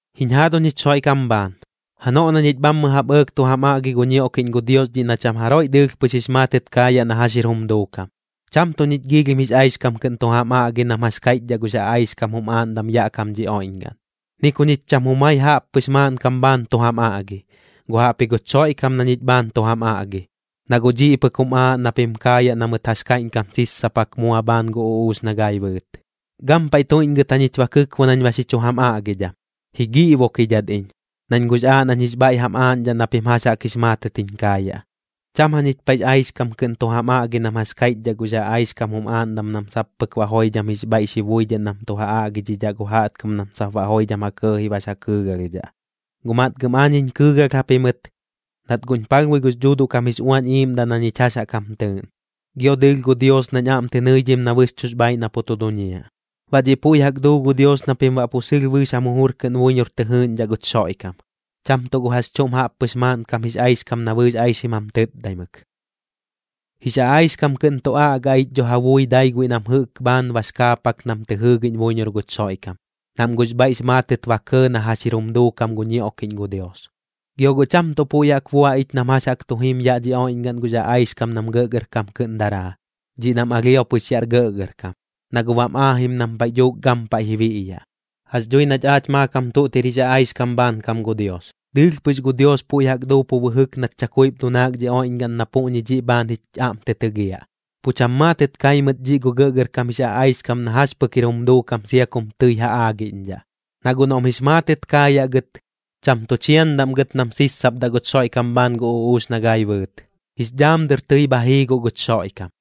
Jiñ jaaduñ jich Xoiꞌkam bhaan, janoꞌ na ñich bhammɨ jaꞌp ɇɇk tu jam aꞌgi gu ñioꞌkiꞌñ gu Dios dhiꞌ na cham jaroiꞌ dɨɨlh pɨx jix maatɨt kaayaꞌ na jax jir jum duukam, cham tuꞌ ñich giilhim jix aixkam kɨꞌn tu jam aꞌgi nam jax kaiꞌchdhaꞌ gux aꞌaixkam jum aaꞌndam yaꞌ kam dhi oiꞌñgaꞌn. Ni ku ñich cham jumai jaꞌppɨx maaꞌnkam bhaan tu jam aꞌgi, guꞌ jaꞌpji guch Xoiꞌkam na ñich bhaan tu jam aꞌgi, na guꞌ dhiꞌ pɨk jum aaꞌ na pim kaayaꞌ na mɨt jax kaiꞌñkam sissapak mua bhaan gu uꞌuux na gai bɨɨt. Gampaiꞌ tuiꞌñgɨt jañich ba kɨkbo nañ ba xi chu jam aꞌgidham, ji giꞌbokidhat iñ, nañ guꞌx aaꞌ nañ jix bhaiꞌ jam aaꞌñdhaꞌ na pim jax jaꞌk jix maatɨt jiñ kaayaꞌ. Cham jañich paiꞌx aixkam kɨꞌn tu jam aꞌgi nam jax kaiꞌchdhaꞌ gux aꞌaixkam jum aaꞌndam nam sap pɨk baꞌ joidham jix bhaiꞌ xi buidhaꞌ nam tu ja aꞌgidhidhaꞌ gu jaꞌtkam nam sap baꞌ joidham ja kɇɇji bax ja kɨɨgalhdhaꞌ. Guꞌ matgɨm aañ jiñ kɨɨgalh japimɨt, nat guꞌñ palhbui gux Dhuuduꞌ kam jix Uañ Iiꞌmdaꞌ na ñich jax jaꞌk jam tɨɨꞌn, gio dɨɨlh gu Dios nañ aꞌm tɨ nɨidhim na bɨxchuꞌx bhaaiꞌ na pu tu duñiaꞌ. Baꞌ dhiꞌ puiꞌ jaꞌk duu gu Dios na pim baꞌ pu sɨlh bɨɨx jam jujur kɨꞌn buiñor tɨ jɨɨꞌñdhaꞌ guch Xoiꞌkam, cham tuꞌ gu jax chuꞌm jaꞌppɨx maaꞌnkam jix aixkam nat bɨɨx aixim jam tɨtdaimɨk. Jix aꞌaixkam kɨꞌn tu aꞌga ich dho ja bui dai guiꞌ nam jɨꞌk bhaan bax kaapak nam tɨ jɨɨgiꞌñ buiñor guch Xoiꞌkam, nam guꞌx bhaiꞌx maatɨt ba kɇɇ na jax jir jum duukam gu ñioꞌkiꞌñ gu Dios. Gio guꞌ cham tuꞌ puiꞌ jaꞌk bua ich nam jax jaꞌk tu jim yaꞌ dhi oiꞌñgaꞌn gux aꞌaixkam nam gɇꞌgɇrkam kɨꞌn daraa, dhiꞌ nam alhio pɨx yaꞌr gɇꞌgɇrkam, na guꞌ bam aajim nam paiꞌ dhuuk gampaiꞌ ji biꞌyaꞌ. Jax dhui nach aach maakam tuꞌt jir jix aꞌaixkam bhaankam gu Dios, dɨɨlh pɨx gu Dios puiꞌ jaꞌk duu pu bɨjɨk nat chakuip dunaak dhi oiꞌñgaꞌn na puꞌñi dhiꞌ bhaan jich aꞌm tɨ tɨgiaꞌ. Pu cham maatɨt kai mɨt dhiꞌ gu gɇꞌgɇrkam jix aꞌaixkam na jax pɨk jir jum duukam sia kum tɨi ja aagiꞌñdhaꞌ. Na guꞌ noꞌm jix maatɨt kaayaꞌ gɨt, cham tu chiandaꞌm gɨt nam sissapdaꞌ guch Xoiꞌkam bhaan gu uꞌuux na gai bɨɨt, jix dhaam dɨr tɨi bha jii guꞌ guch Xoiꞌkam.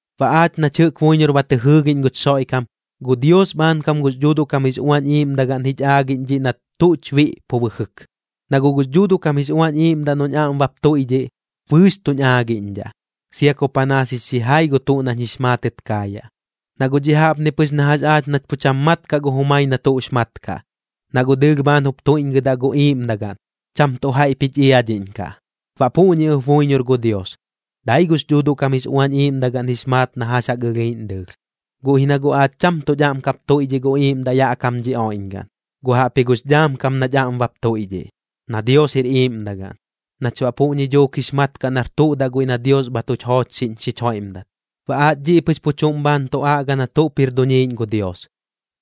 Baꞌ aach nach jɨꞌk buiñor ba tɨ jɨɨgiꞌñ guch Xoiꞌkam, gu Dios bhaankam gux Dhuuduꞌ kam jix Uañ Iiꞌmdagaꞌn jich aagiꞌñ dhiꞌ nat tuꞌch biꞌ pu bɨjɨk. Na guꞌ gux Dhuuduꞌ kam jix Uañ Iiꞌmdaꞌ noꞌñ aꞌm bap tuiꞌdhiꞌ, bɨɨx tuñ aagiꞌñdhaꞌ, sia ku panaas jix xijai gu tuꞌ nañ jix maatɨt kaayaꞌ. Na guꞌ dhiꞌ jaꞌpni pɨx na jax aach nach pu cham mat kaꞌ gu jumai na tuꞌx mat kaꞌ, na guꞌ dɨɨlh bhaan jup tuiꞌñgɨdaꞌ gu iiꞌmdagaꞌn, cham tuꞌ jaiꞌp jich iadhiꞌñkaꞌ. Baꞌ puꞌñi ɨp buiñor gu Dios, dai gux Dhuuduꞌ kam jix Uañ Iiꞌmdagaꞌn jix maat na jax jaꞌk ɨlhiiꞌñ dɨɨlh. Guꞌ ji na guꞌ aach cham tuꞌch aꞌm kap tuiꞌdhiꞌ gu iiꞌmdaꞌ yaꞌ kam dhi oiꞌñgaꞌn, guꞌ jaꞌpji gux dhaam kam nach aꞌm bap tuiꞌdhiꞌ, na Dios jir iiꞌmdagaꞌn, nach baꞌ puꞌñi dhuuk jix mat kaꞌ nar tuꞌ daꞌ guiꞌ na Dios bha tuch joochxiꞌñ xich joiꞌmdat. Baꞌ aach dhiꞌ pɨx pu chuꞌm bhaan tu aꞌga na tuꞌp jir duñiiꞌñ gu Dios,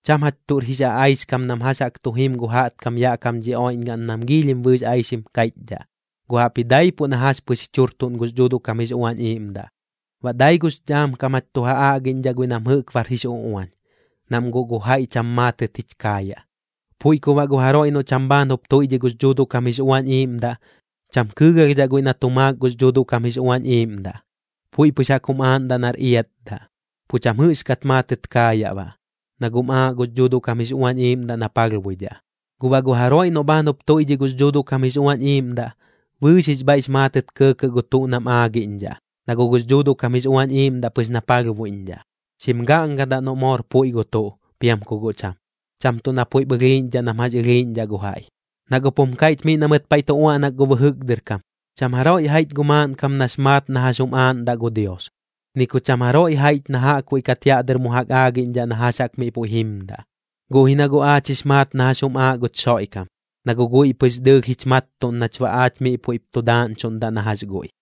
cham jach tuꞌr jix aꞌaixkam nam jax jaꞌk tu jim gu jaꞌtkam yaꞌ kam dhi oiꞌñgaꞌn nam giilhim bɨɨx aixim kaiꞌchdhaꞌ, guꞌ jaꞌpji daipuꞌ na jax pɨx jich jurtuꞌn gux Dhuuduꞌ kam jix Uañ Iiꞌmdaꞌ. Baꞌ dai gux dhaam kam jach tu ja aꞌgiꞌñdhaꞌ guiꞌ nam jɨꞌk bar jix uꞌuañ, nam guꞌ gu jaiꞌ cham maatɨt jich kaayaꞌ. Puiꞌ ku baꞌ gu jaroiꞌ noꞌ cham bhaan jup tuiꞌdhiꞌ gux Dhuuduꞌ kam jix Uañ Iiꞌmdaꞌ, cham kɨɨgalhdhaꞌ guiꞌ na tu maak gux Dhuuduꞌ kam jix Uañ Iiꞌmdaꞌ, puiꞌ pɨx jaꞌk jum aaꞌndaꞌ nar iatdaꞌ. Pu cham jɨꞌxkat maatɨt kaayaꞌ baꞌ, na guꞌm aaꞌ gux Dhuuduꞌ kam jix Uañ Iiꞌmdaꞌ na palhbuidhaꞌ. Guꞌ baꞌ gu jaroiꞌ noꞌ bhaan jup tuiꞌdhiꞌ gux Dhuuduꞌ kam jix Uañ Iiꞌmdaꞌ, bɨɨx jix bhaiꞌx maatɨt kɇɇkɇꞌ gu tuꞌ nam aagiꞌñdhaꞌ. Na guꞌ gux Dhuuduꞌ kam jix Uañ Iiꞌmdaꞌ pɨx na palhbuiꞌñdhaꞌ, xim gaꞌngadaꞌ noꞌ moor puiꞌ gu tuꞌ, piam ku guꞌ cham, cham tuꞌ na puiꞌp ɨlhiiꞌñdhaꞌ nam jax ɨlhiiꞌñdhaꞌ gu jaiꞌ. Na guꞌp jum kaiꞌch miꞌ na mɨt paiꞌ tu uaꞌnak gu bɨjɨk dɨr kam: “Cham jaroiꞌ jaiꞌch gu maaꞌnkam nax maat na jax jum aaꞌndaꞌ gu Dios, ni ku cham jaroiꞌ jaiꞌch na jaꞌkbuiꞌ kat yaꞌ dɨr mu jaꞌk aagiꞌñdhaꞌ na jax jaꞌk miꞌ puiꞌ jimdaꞌ.” Guꞌ ji na guꞌ aach jix maat na jax jum aaꞌ guch Xoiꞌkam, na guꞌ guiꞌ pɨx dɨɨlh jich mattuꞌn nach baꞌ aach miꞌ puiꞌp tu daaꞌñchuꞌndaꞌ na jax guiꞌ.